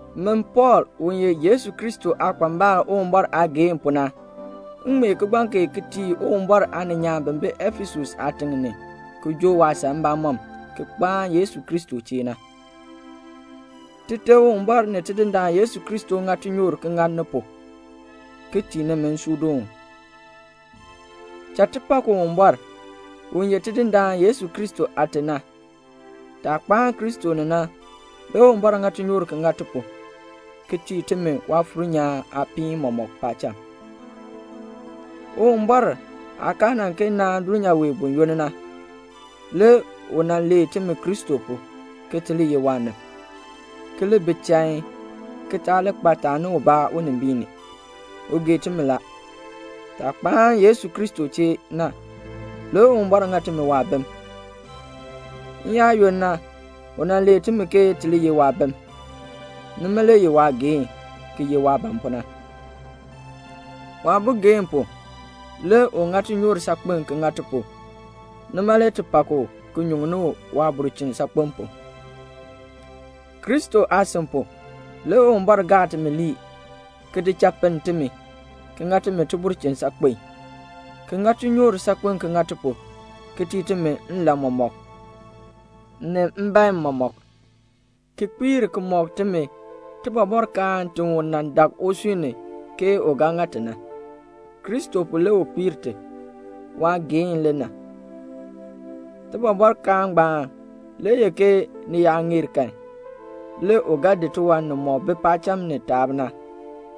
Min Pɔɔl, u ye Yesu Kristo aakpambal Uwumbɔr aageehn pu na, m ŋmee kigbaŋ kee ki tii Uwumbɔr aaninyaan bi bi Efesus aatiŋ ni, ki joo waasan mbamɔm, ki kpaan Yesu Kristo chee. Tite Uwumbɔr ni Tidindaan Yesu Kristo ŋa tinyoor ki ŋa ni pu, ki tii nimi nsuudoon. Cha ti pak Uwumbɔr, u ye Tidindaan Yesu Kristo Aate na. Taah kpaan Kristo ni na, le Uwumbɔr ŋa tinyoor ki ŋa ti pu, ki tii timi Waafuur nyaan aapiin mɔmɔk paacham. Uwumbɔr aah kaa nan kee naan dulnyaa wee buyoonn na, le u nan lee timi Kristo pu, ke ti li ye waanib, ki li bi chain, ki taa li kpa taani ubaa unimbiin ni. U gee timi la. Taah kpaan Yesu Kristo chee na, le Uwumbɔr ŋa timi waabim. N-yaayoonn na, u nan lee timi ke ti li ye waabim. Nima le ye waageehn, ki ye waah ban pu na. Waabogeen pu le u ŋa tinyoor saakpen ki ŋa ti pu, nima le ti pak u ki nyuŋni u waabulchin saakpen pu. Kristo aasin pu, le Uwumbɔr gaa timi lii, ki di cha pinn timi, ki ŋa timi tibulchin saakpen, ki ŋa tinyoor saakpen ki ŋa ti pu, ki tii timi nlan mɔmɔk, ni mbeen mɔmɔk, ki kpiir ki mɔk timi tibɔbɔrkaan ti u nan dak usui ni ke u ga ŋa ti na. Kristo pu le u kpiir ti. Waageehn le na. Tibɔbɔrkaan ngbaan le ye ke ni yaa ŋeer kan, le u ga di tiwan nimɔk bi paacham ni taab na,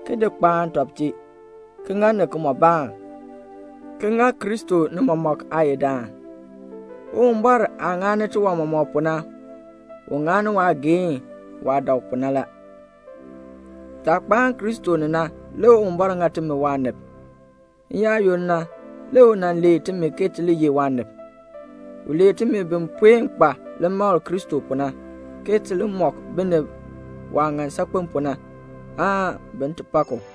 ki di kpaan tɔb chee, ki ŋa ni kimɔbaan, ki ŋa Kristo ni mɔmɔk aayidaan. Uwumbɔr aah ŋani tiwan mɔmɔk pu na, u ŋani waageehn, waah dak pu na la. Taah kpaan Kristo ni na, le Uwumbɔr ŋa timi waanib. N-yaayoonn na, le u nan lee timi ke ti li ye waanib. U lee timi bi puen kpa limakl Kristo pu na, ke ti li mɔk binib waah ŋan saakpen pu na, aan bin ti pak u.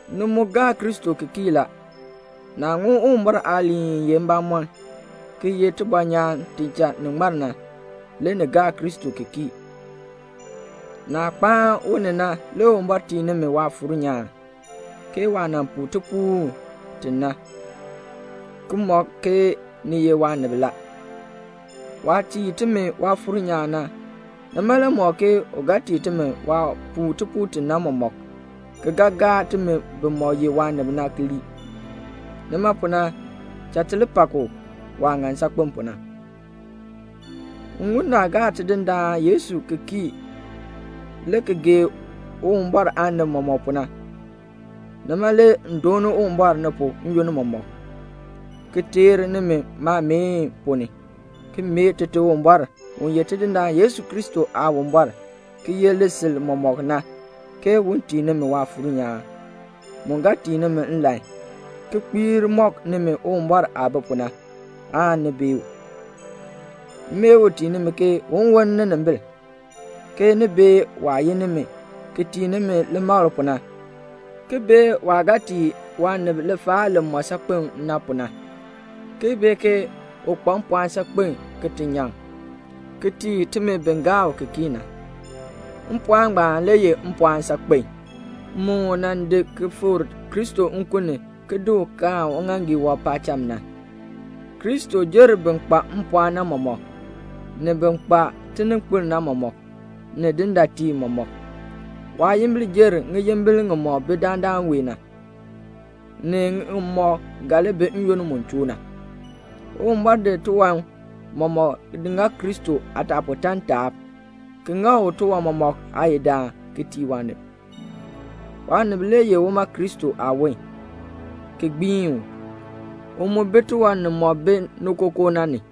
Ni mu gaa Kristo ki kii la. Naah ŋun Uwumbɔr aaliin i ye mbamɔn, ki ye tibɔnyaan ti cha ni ŋmar na, le ni gaa Kristo ki kii. Naah kpaan u ni na le Uwumbɔr tii nimi Waafuur nyaan, ke waah nan puu tipuul ti na, ki mɔk ke ni ye waanib la. Waah tii timi Waafuur nyaan na, nima le mɔk ke u ga tii timi waah puu tipuul ti na mɔmɔk, ki ga gaa timi bimɔk ye waanib na ki lii. Nima pu na, cha ti li pak u, waah ŋan saakpen pu na. M ŋun naah gaa Tidindaan Yesu ki kii le ki gee Uwumbɔr aanib mɔmɔk pu na, nima le m dooni Uwumbɔr ni pu n-yoonn mɔmɔk, ki teer nimi maameen ponn ni, ki mee Tite Uwumbɔr, u ye Tidindaan Yesu Kristo Aawumbɔr, ki yeh lisil mɔmɔk na, ke un tii nimi Waafuur nyaan, mu ga tii nimi nlan, ki kpiir mɔk nimi Uwumbɔr aah bi pu na, aan ni bee u. M mee u tii nimi ke un woln ninimbil, ke ni bee waah yin nimi ki tii nimi limakl pu na, ki bee waah ga tii waanib lifaal li mɔ saakpen pu na, ki bee ke u kpa mpɔɔn saakpen ki ti nyaŋ, ki tii timi bi gaa u ki kii na. Mpɔɔn ngbaan le ye mpɔɔn saakpen, mu u nan di ki fikr Kristo nkun ni na, le ki di u kaan uŋaaŋgii wɔb paacham na. Kristo jer bin kpa mpɔɔn na mɔmɔk, ni bin kpa tininkpil na mɔmɔk, ni dindaatiib mɔmɔk. Waayimbil jer ŋiyimbil ŋimɔk bi dandana wee na, ni ŋimɔk ga li bi n-yoonn mu choo na. Uwumbɔr di tiwan mɔmɔk di ŋa Kristo aataapɔtaan taab, ki ŋa u tiwan mɔmɔk aayidaan ki tii waanib. Waanib ye uma Kristo aawon, ki gbiin u; u mu bi tiwan nimɔk bi ni kookoo na ni.